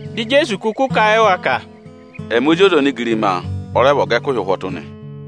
Di Ijeesu kụkụ kà a yị wa ka, “Ẹmị Ozi ọza onigirima ọ rẹ vị ọga ẹkụhị ụhwọtụ nị.”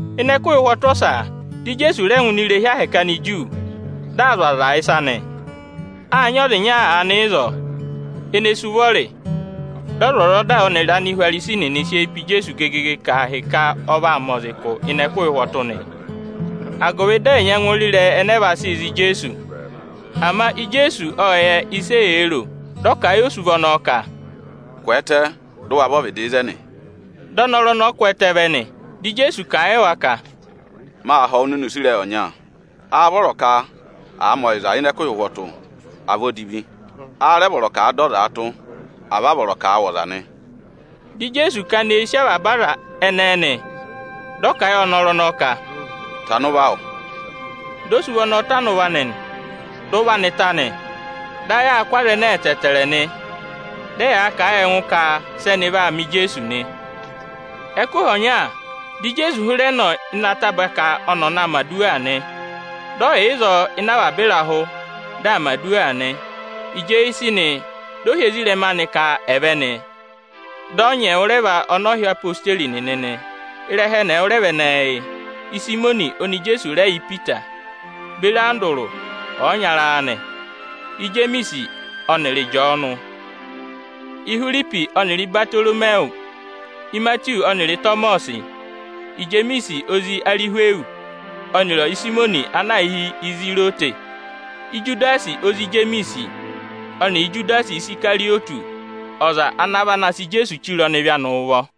Ịnị ẹkụhị ụhwọtụ ọsa, di Ijeesu rẹ ngụ ini irehi ahẹkẹ Aniju, dị aa zụ̀ aza ịsa nị. Â nyị ọza ịnya aanị ịzọọ, ene sú ụvọrị. Dị ọzwọzọda ọnịrị Anihwarisi nịnị sị eyi pe Ijeesu gegege ka ahịka ọ vaa mẹ ọza ụkụ ịnị ẹkụhị ụhwọtụ nị, agụvị dị ẹ̀ nyẹngụ re ịrẹyị ẹnẹẹ vaa sị za Ijeesu. Ama Ijeesu ộ yẹ ịsị eyee ro, dị ọ kà a yị osuvọ ọnọọ ka, “Kwẹẹtẹ, dị ụ wa vẹ ọvịdị ịzẹnị!” Dị ọnọrụ ọnọọ kwẹẹtẹ vẹ nị. Dị Ijeesu kà a yị wa ka, “Maa họ̀ wụ nịnị use ịrẹyị ọnya: Áá vọrọ ka à mẹ ọyịza ịnị ẹkụhị ụhwọtụ, à vị odivi? Áá rẹ vọrọ ka à dọ ọza tụ́, à vị a vọrọ ka à wụ̀ ọza nị?” Dị Ijeesu kana eyi sì avaba aza ẹnẹẹ nị, dị ọ kà a yị ọnọrụ ọnọọ ka, “Tana ụvọ awụ!” Di osuvọ ọnọọ tana ụvọ anị, dị ụvọ anị ta nị. Dị ayị aa kụ́ aza ẹnẹẹ ẹtẹẹtẹrẹ nị, dị ẹyaa kà a yị ẹngụ ka sị ẹnị vaa mẹ Ijeesu nị. Ẹkụhị ọnya, dị Ijeesu hịrẹ nọ ịnị ataba ka ọnị aa na mẹ̀ aduwa nị. Dị ọ yà ịzọọ ịnị avaba ịrahụ, dị aa mẹ̀ aduwa nị. Ịjị eyi sị nị, dị ọ hị́ ezirẹma anị ka ẹ̀ vẹ nị. Dị ọ nyị ẹwụrẹva ọnị ọ hị́ odeyi nịnị nị. Ịrẹha ẹnị ẹwụrẹva ẹnẹẹ yị: Ịsayịmọnị oni Ijeesu rẹ yị Ipita, beri Andụrụ ọyịnyara anị; Ijemiisi ọnịrị Ịjọọnụ; Ihwiripi ọnịrị Ibatoromiwu; Imatiwu ọnịrị Ịtọmọsị; Ijemiisi, ozi Arịhwịyọsị ọnịrị Ịsayịmọnị ana aā hị́ Izirọtị (Anakwẹngụhi); Ijudasi, ozi Ijemiisi ọnịrị Ijudasi Isikarịyọtị, ọza ana vana sị Ijeesu chire ọnịvị anị ụvọ.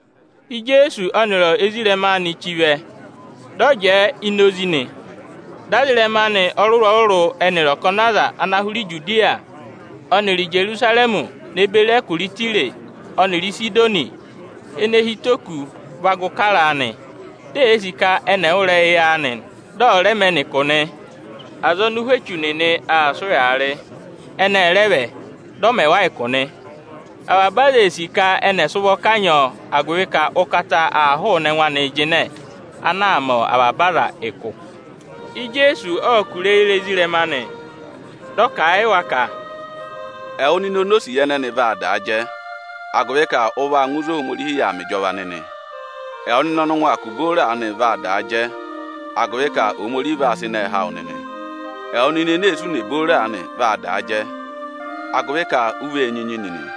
Ịjị Ijeesu ọnịrị ezirẹma anị zi chí vẹ, dị ọ Jẹẹ inozi nị. Dị aza ịrẹma anị ọrụrụ-ọrụrụ ẹnịrị ọkọnị aza ana hụrẹ Ijudiya ọnịrị Ijerusarẹmị ne beri ẹkụra Ịtaya ọnịrị Ịsịdọnị ene hi ụtọ oku va gụ kara a nị. Di eyee sì ka ẹnị ẹ̀ wụ́ ịrẹyị anị, dị ẹ̀ rẹ mẹ ẹnị ụkụ nị. Aza ọnị ụhwẹ echu nịnị aa sị ụyaa rị, ẹnị ẹ rẹ vẹ, dị ọ mẹ wa ụkụ nị. Avaba aza ee sì ka ẹnị ẹ̀ sị ụvọ kanyị ọọ, agụvị ka ụkata aa hụụnị ẹngụ anịị jịnẹ, ana aa mẹ avaba aza ụkụ. Ijeesu ộ kụ̀rà eyi re ezirẹma anị, dị ọ kà a yị wa ka, “Ẹwụ nịnị onosiye ẹnẹnị vaa daa jẹ, agụvị ka ụ vaa ngụ ịzị Ohomorihi yà aa mẹ ịjọva nịnị. Ẹwụ nịnị ọnị ụngwẹ aa kụ̀ booro aanị vaa daa jẹ, agụvị ka Ohomorihi vaa sị ịnẹẹ há wụ nịnị. Ẹwụ nịnị ene ee sụ ùnè booro aanị vaa daa jẹ, agụvị ka u vee nyinyi nịnị.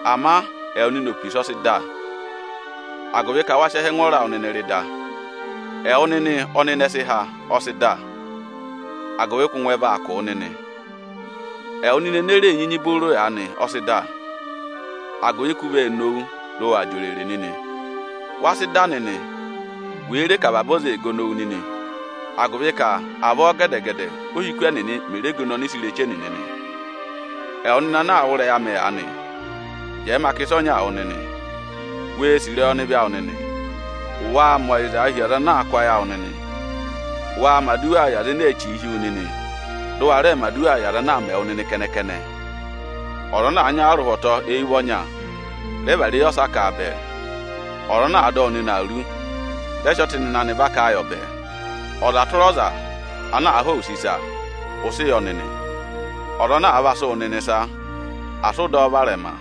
Ama ẹwụ nịnị opisa, ọ sị dà, agụvị ka wa sị ẹhẹ ẹngwọọrọ awụ nịnị rị da. Ẹwụ nịnị ọnị ịnẹ sị há, agụvị ka ụngwẹ vaa kụ̀ wụ nịnị. Ẹwụ nịnị ene ree nyinyi booro aanị, ọ sị dà, agụvị ka u vee nowu, dị ụ waa jị òrèrè nịnị. Wa sị dà nịnị, wèe re ka avaba aza ee gono wu nịnị, agụvị ka avọọ gẹdẹ-gẹdẹ óhiku ẹnịnị mè re gono ọnịsẹ ireche nịnị nị.” “Ẹwụ nịnị ana aa wụ́ ịrẹyị amị aanị, jẹẹ ma kà ịsa ọnyaa wụ nịnị: Wee sì ịrẹyị ọnịvị awụ nịnị, waa mẹ ọyịzaa hi aza ana a kụ́ ayị awụ! Waa mẹ̀ aduwa yị aza ene ee chìi hi wu nịnị, dị ụ wa rẹẹ mẹ̀ aduwa yị aza ana aa mẹ wụ nịnị kẹnẹ-kẹnẹ! Ọza ana àa nya wụ arụhwọtọ eyi ụvọ ọnya, rẹ vara eyi ọsa ka a bẹẹ! Ọza ana àa dọ wụ nịnị awuru, rẹ sị ọtịnịnẹ anị vaka a yọ bẹẹ! Ọza tụra ọza ana àa họ̀ wụ use ịsa, ụ sị yọ nịnị! Ọza ana àa va sị wụ nịnị ịsa, asị ụ dọ ọ varẹma!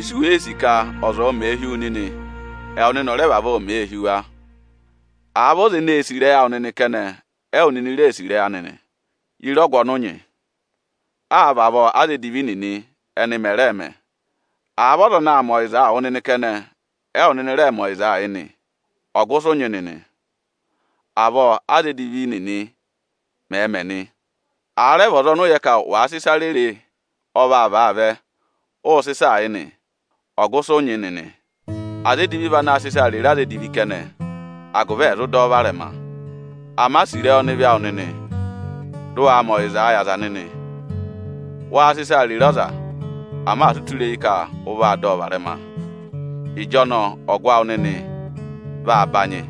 Ịsị u wèe sì ka ọza ọ̀ọ mẹẹ hi wu nịnị, ẹwụ nịnị ọ̀ rẹ vavọọ mẹẹ hi wa! Àa vị ọza ene sì ịrẹyị awụ nịnị kẹnẹ, ẹwụ nịnị reē sì ịrẹyị anị nị, ye re ọgụ ọnị ụ nyị? Áa vavọọ aza edivi nịnị ẹnị mẹ̀ rẹẹ̄ mẹ. Àa vị ọza anaā mẹ ọyịzaa wụ nịnị kẹnẹ, ẹwụ nịnịị̄ rẹẹ mẹ ọyịza yị nị, ọgụ ịsị ụ nyị nịnị? Avọọ aza edivi nịnị mẹ̀ẹ̄ mẹ nị. Àa rẹ vị ọza ọnị ụ yẹ ka wàa sị ịsa rere ọ vaa vàa vẹ, ụụ̄ sị ịsaa yị nị, ọgụ ịsị ụ nyị nịnị? Aza edivi vị anaā sịị ịsaa rere aza edivi kẹnẹ, agụvị ẹ̀ zụ dọ ọ varẹma. Ama sì ịrẹyị ọnịvị awụ nịnị, dị ụ waa mẹ ọyịzaa yị aza nịnị! Waa sị ịsaa rere ọza, ama asị u tụra eyi ka ụ vaa dọ ọ varẹma! Ịjọnọọ ọgụ awụ nịnị vaa banyị,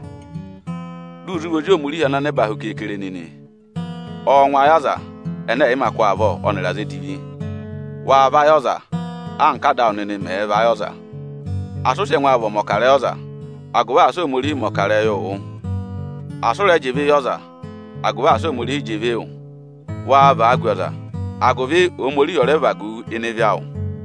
dị ụ zụ vị ozi Ohomorihi ana aha ene hu keekere nịnị. Ọọ̄ ngụ ayị aza ẹnẹ ẹ̀ yị mā kụ́ avọ, ọnịrị aza edivi. Waa vayị ọza, anka Áda awụ nịnị mẹ̀ẹ̄ vayị ọza.” “Asị ụ sị ẹngụ awụ vị ọmọkarẹyị ọza, agụvị asị Ohomorihi mẹ̀ ọkarẹyị wụ! Asị ụ rẹ jị ịvị yị ọza, agụvị asị Ohomorihi jị ịvị wụ! Waa vagu ọza, agụvị Ohomorihi ọ̀ rẹ vagu wu ịnị ịvị awụ.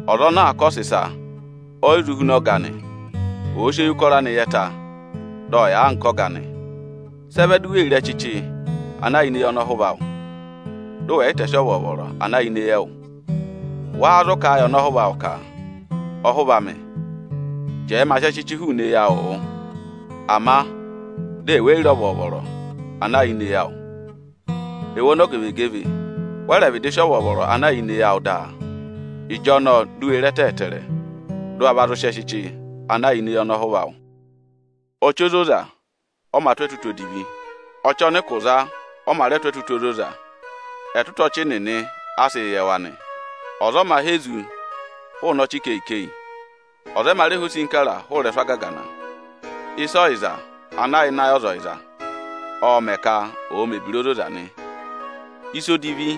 Ọza ana aa kọsẹ ịsa, o yi zụ huna ọga anị, ama ọ̀ọ sị eyi ụkọrọ anị yẹ ta, dị ọ yà anka ọga anị. Sị ẹ vẹ di u wee re ẹchịchị ana yà ini eyi ọnọhụva awụ, dị ụ wẹ̀ yị tẹsị ọvọọvọrọ ana yà ịnị ẹ́ẹwụ? Wáá zụ ka ẹ yị ọnọhụva awụ ka: ‘Ọhụva amị, jẹẹ ma sị ẹchịchị hụụnị eyi awụụ wụ’, ama dị ẹwụ e yi re ọvọọvọrọ ana yà ini eyi awụ? Ẹwụ ọmọzakụyẹ, wẹ rẹ̀ vịdị sị ọvọọvọrọ ana yà ini eyi awụ daa! Ịjọnọọ di u wee re ẹtẹ ẹtẹẹrẹ, dị ụ wa va zụ sị ẹchịchị ana yà ini eyi ọnọhụva awụ.” “Ọchị ozoza ọ mā tụ́ ẹtụtụ odivi; ọchị ọnị ụkụ za ọnị ọ mā rẹ tụ́ ẹtụtụ ozoza. Ẹtụtụ ọchị nịnị a sịị̄ yẹ wa nị. Ọza ọ mā há ezu hụụnị ọchị ikeyi-ikeyi. Ọza ọ mā rẹ há osinkara hụụ ịrẹsụ agagana. Ịsa ọyịza ana yà ịnị ayị ọza ọyịza, ọọ̄ mẹ̀ ka ọ̀ọ mẹ̀ ebira ozoza nị. Ịsa odivi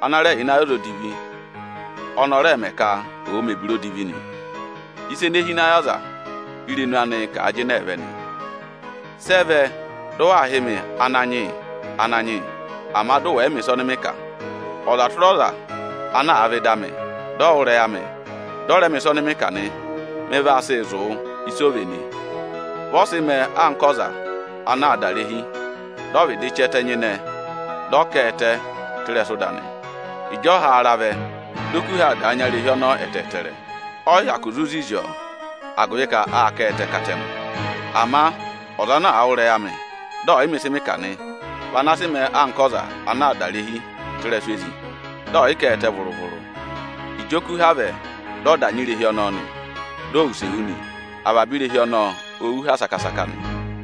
ana rẹ yà ịnị ayị ọza odivi, ọnị ọ rẹẹ̄ mẹ ka ọ̀ọ mẹ̀ ebira odivi nị. Ịsa ene hi ịnị ayị ọza, írenu anịị̄ kà a jịnẹẹ vẹ nị.” “Sị ẹ vẹ dị waa hị́ mị ‘Ananyị yị, Ananyị yị’, ama dị ụ wẹ yị mẹ̀ ịsa ọnị mị kà? Ọza tụra ọza ana àa vẹ ịdị amị, dị ọ wụ́ ịrẹyị amị dị ọ rẹ mẹ̀ ịsa ọnị mị kà nị, mị vaa sịị zụ̀ wụ ịsị o véné. Vị ọ sị mẹẹ anka ọza ana aa dà irehi, dị ọ vịdị chị ẹtẹ nyịnẹ, dị ọ kà ẹtẹ tụ́ ịrẹsụ ịda nị. Ịjị ọhaara vẹ, di okuha dà nya irehi ọnọọ ẹtẹẹtẹrẹ nị, ọ yị hyakụ zụ zizi ọọ; agụvị ka â ká a ẹtẹ katẹngụ. Ama ọza ana àa wụ́ ịrẹyị amị, dị ọ̀ yị mẹ ịsị mị kà nị, vị ana sị mẹẹ anka ọza ana dà irehi tụ́ ịrẹsụ ezi, dị ọ̀ yị ká a ẹtẹ vụrụ-vụrụ. Ịjị okuha vẹ, dị ọ dà nya irehi ọnọọ nị, dị ọ wụsẹ wú nị; avaba irehi ọnọọ o wú ha saka-saka nị.”